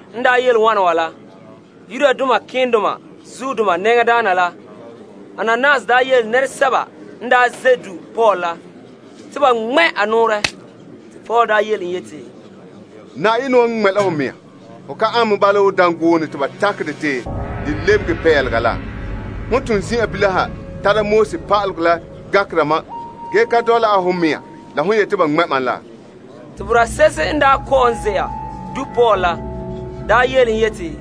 En daa yele wana wa la, malema nɛŋadaana Ananias daa yele nɛresɛba n daa ze' du' Paul la te ba ŋmɛ' a nɔɔrɛ. Paul nya yele en yeti, Yenɛ wan ŋmɛ' la ho mea! Hon ane bala wo dangoone kɛka te ba takɛ dɛ te de lebege pelega la! Ho ton zin'an bilam ha tara pa'alegɔ la gankera mam ge ka dɔla a ho mea la hon yete ba ŋmɛ' mam la. Te boraa se'ehe n daa kɔ'ɔn ze'a du' Paul la daa yele en yeti,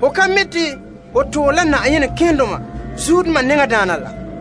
Ho ka mi' te ho toore la malema nɛŋadaana la?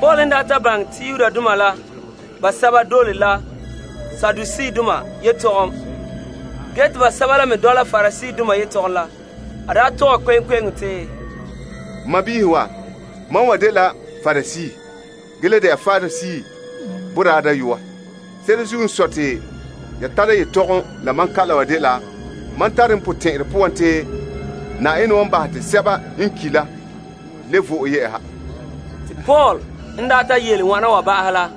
Paul n ta baŋɛ te bama basɛba n de Saduseedoma te basɛba la me n de Pariseedoma, a tɔgɛ la Yetɔgom Tɔgɔrɔba kpe'eŋkpe'eŋo te, N sɔɔnrɔ wa, mam wa dela Parisee ge le de'a Parisee boraa dayɔa. Se'ere zuo n sɔe te ya tara yetɔgom la ma kalam wa dela mam tare n potɛn'ɛrɛ poan te Yenɛ wan bahɛ te sɛba n ki' la le vɔna yɛ'ɛha. En ta yele wana wa ba'ahɛ la,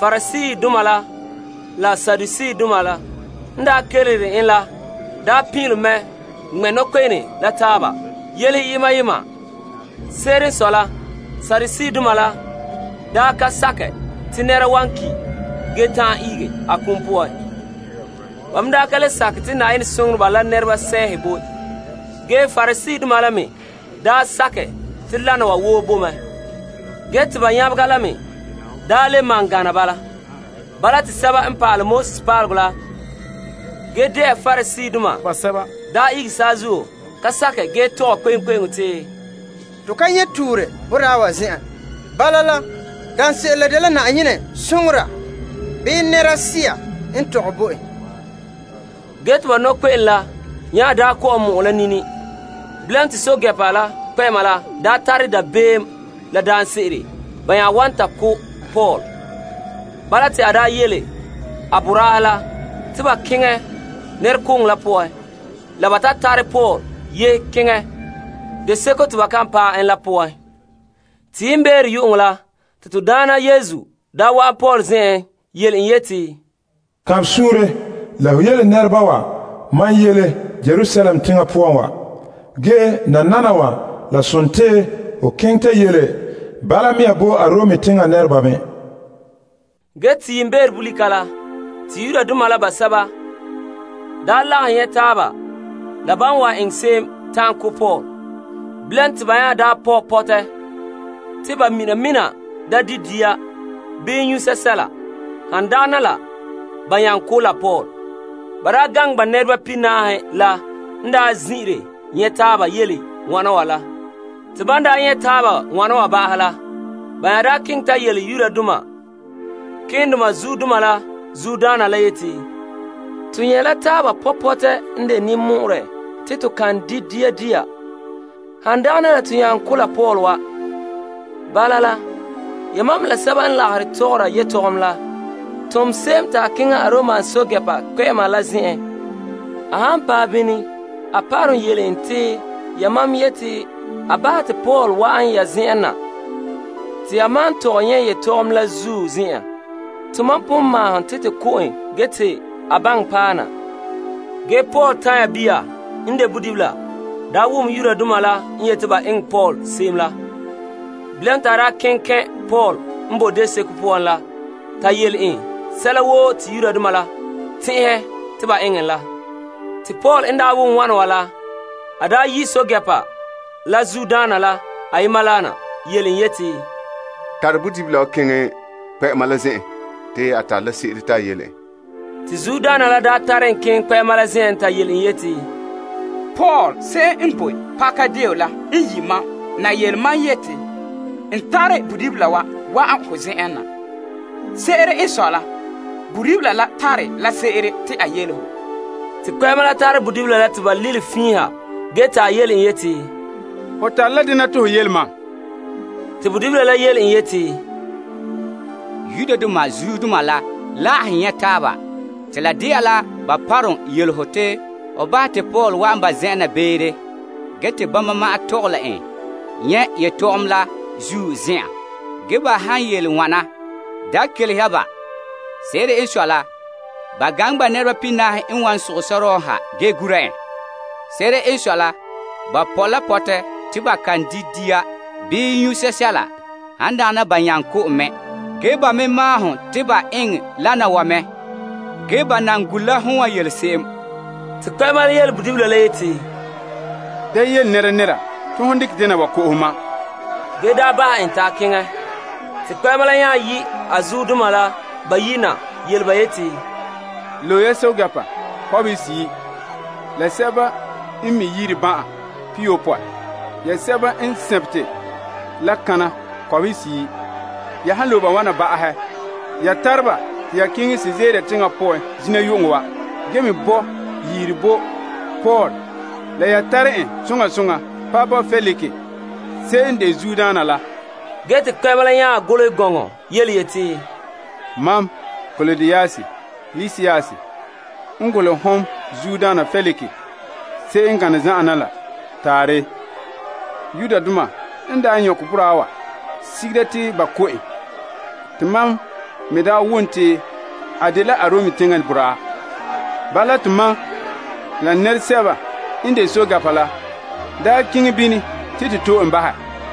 Pariseedoma la la Saduseedoma pin'ilom mɛ ŋmɛ' nɔkpe'ene la taaba yelehe yema yema. Se'ere n sɔe la Saduseedoma la daa ka sakɛ te nɛra wan ki' ge ta'an ihege a kum poan. Ba me da ka le sakɛ te Yenɛ soŋoreba la se'ehe boe. Ge Pariseedoma la me daa sakɛ te lana wa woo boe mɛ. Ba nyabega la gana bala te pa'alegɔ pa'aleba la ge de'a Pariseedoma basɛba ihege saazuo ka sakɛ ge tɔgɛ kpe'eŋkpe'eŋo te, To ka nyɛ' tuure boraa wa zen'en. Bala la, daanse'ere la dela Yenɛ soŋora bii sea n tɔgɛ bo en. Ge te ba nɔkpe'ene la nya kɔ'ɔn mɔ'ɛn la nini. Bilam te pɛɛntɛɛnreba la kpɛ'ɛma la tara dabeem la daanse'ere ba ya wan ta ko' Paul. Bala te a yele a boraahe la te ba keŋɛ nɛrekooŋɔ la poan la ba ta tare Paul yehe keŋɛ deo seko te ba kan paɛ en la poan. Te yiimbeere yu'uŋɔ la, te to Daana wa'an Paul zen'en yele en yeti, Kaanbɛ suunre! Wo ho yele nɛreba mam yele Yerusalem teŋa poan wa, nananawa la sontii ho keŋɛ ta yele bala mea nɔɔ bo Arom teŋa nɛreba me. Yiimbeere bolika la, Yudoma basɛba lagahɛ nyɛ' taaba la ban wan eŋɛ se'em ta'an ko' Paul. Bilam te ban nya pɔ' pɔtɛ te ba mina mina da di' dia bii nyu' sɛsɛla, han dagana ba nyaŋɛ ko' la Paul. Ba gaŋe ba nɛreba pihinaahe la n daa zin'ire nyɛ' taaba yele wana wa la. Te ban nyɛ' taaba wana wa ba'ahɛ la, ba nya keŋɛ ta yele malema keendoma la zuodoma la yeti, To nyɛ' la taaba pɔ' pɔtɛ n de ninmɔ'ɔrɛ te to kan di' dia dia, han dagana la to nyaŋɛ ko' la Paul wa. Bala la, yamam la Yetɔgom Tɔgɔrɔba la tom se'em te a keŋɛ Aromdoma pɛɛntɛɛnreba kpɛ'ɛma la zen'en. A han paɛ bini ya parom yele en te yamam yete a bahɛ te Paul la wa'an ya zen'en na te ya maan tɔgɛ nyɛ' yetɔgom la zuo zen'en. Ge tomam pon maahom te to ko' en ge te a baŋɛ paɛ na. Ge Paul tanya bia wom Yudoma la n yete ba eŋɛ Paul se'em la. Bilam te a keŋɛ kɛn' Paul n bo deo seko poan la ta yele en sɛla woo te Yudoma la tɛn'ɛhɛ te ba eŋɛ en la. Paul n daa wom wana wa la, a yi' pɛɛntɛɛnreba la zuodoma la ayema na yele en yeti, Tare bodibila wa keŋɛ kpɛ'ɛma la zen'en te a tare la se'ere te a yele en. Te zuodaana la tare en keŋɛ kpɛ'ɛma la zen'en ta yele en yeti, Paul se'em n boe pakadeen la n yi' mam na yele mam te n tare bodibila wa wa'an ho zen'en na. Se'ere n sɔe la, bodibila la tare la se'ere te a yele ho. Te kpɛ'ɛma la tare bodibila la ta ba lilom fiin ha ge te a yele en yeti, Ho tare la dene te ho yele mam? Bodibila la yele en yeti, Yudoma zuodoma la lagahɛ nyɛ' taaba te la de'a la ba parom yele ho te ho bahɛ te Paul wa'an Yetɔgom Tɔgɔrɔba zen'en na beere te bama maan tɔgɛ la en nyɛ' yetɔgom la zuo zen'an. Ge ba han yele wana, da kelehe ba. Se'ere n sɔe la, ba gaŋɛ ba nɛreba pihinaahe n wa sogɛ sɔrɔɔ n ha ge gura en. Se'ere n sɔe la ba pɔ' la pɔtɛ te ba kan di' dia dia bii nyu' sɛsɛla, han dagana ba nyaŋɛ ko' en mɛ. Ge ba me maahom te ba eŋɛ lana wa mɛ, ge ba nan gure la hon wan yele se'em. Kpɛ'ɛma la nya yele bodibila la yeti, Da yele nɛnɛra te hon dekɛ dena wa ko'ohe bo mam. Ge te a daa bahɛ en te a keŋɛ. Te a nya yi' a zuodoma la bayi' na yele ba yeti, Loe ya pɛɛntɛɛnreba kɔbehe seyi' la ya sɛba n mi' yiriban'an pihiyopɔe, ya sɛba n sabete la kana kɔbehe seyi'. Ya han loe ba wana ba'ahɛ, ya tare la ba te ya keŋɛ Kaesarea teŋa poan zina yu'uŋɔ wa. Ge me bɔ' yiri bo Paul la ya tara en soŋa soŋa paɛ bo Feliks se'em n de zuodaana la. Ge te kpɛ'ɛma la nya golehɛ gɔŋɔ yeti, Mam Klaudius Lisias n golehɛ hon Teŋbehera Feliks se'em n gane zan'an la na. Taarɛ. Yudoma n daa nyɔkɛ boraa wa sigera te ba ko' en. Mam n daa wom te a dela Arom teŋa boraa, te mam la n nɛresɛba n de pɛɛntɛɛnreba la daa keŋɛ bini te to to'e en bahɛ.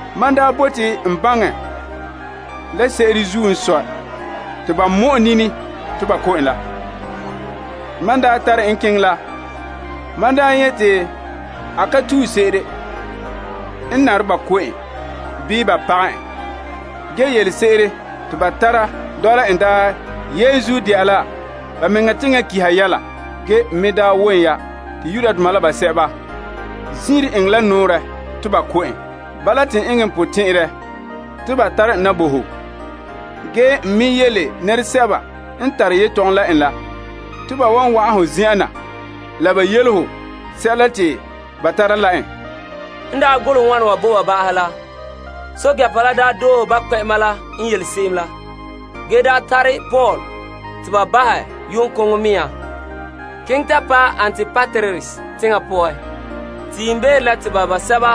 Mam n daa bote n baŋɛ la se'ere zuo n sɔe te ba mɔ'ɛn nini te ba ko' en la, te n tare en keŋɛ ba Yetɔgom Tɔgɔrɔba zen'an la. Mam daa nyɛ' te a ka tue se'ere n nare ba ko' en bii ba pagɛ en. Yelese'ere te ba tara dɔla en daa yenzuo de'a la ba mea teŋa pa'alegɔ yɛla. Mam me daa wom ya te Yudoma la basɛba zin'ire enŋɛ la nɔɔrɛ te ba ko' en. Bala te n eŋɛ n potɛn'ɛrɛ te ba tare en na bo ho. Ge n me yele nɛresɛba n tare yetɔgom la en la, te ba wa'an hon zen'en na la ba yele ho sɛla te ba tara la en. En daa golehɛ wana wa bo ba ba'ahɛ la, a pɛɛntɛɛnreba la doohe en yele se'em la. Ge ba tare Paul te ba bahɛ yu'uŋkoŋɔ mea nɔɔ keŋɛ ta paɛ Antipatris teŋa poan. Te yiimbeere la, te ba basɛba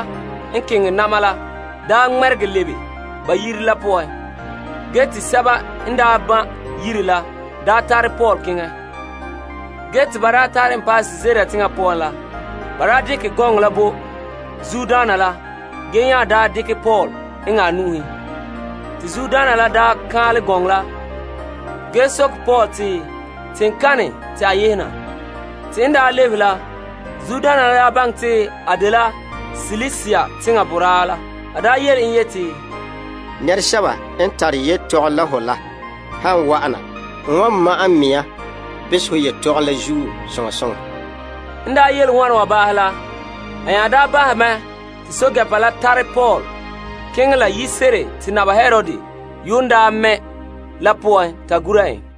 n keŋɛ na'ma la daa ŋmɛregɛ lebe ba zen'an la poan te sɛba n ban' yire la tare Paul keŋɛ. Yiriban'andoma n tare en paɛ Kaesarea teŋa poan la, ba dekɛ gɔŋɔ la bo teŋbehera la, ge nya dekɛ Paul eŋɛ a nu'uhen. Teŋbehera la n daa kan'anlɛ gɔŋɔ la, a soke Paul te teŋkana te a yehe na. En ta baŋɛ te a dela Silisia teŋa boraa la, a yele yeti, Nɛresɛba n tare yetɔgom la ho la han wa'an na, n wan ma'ɛn n mea behɛ ho yetɔgom la zuo soŋa soŋa. A nya bahɛ mɛ te pɛɛntɛɛnreba la tare Paul keŋɛ la yire se'ere te Naba Herod yuun daa mɛ' la poan ta gure en.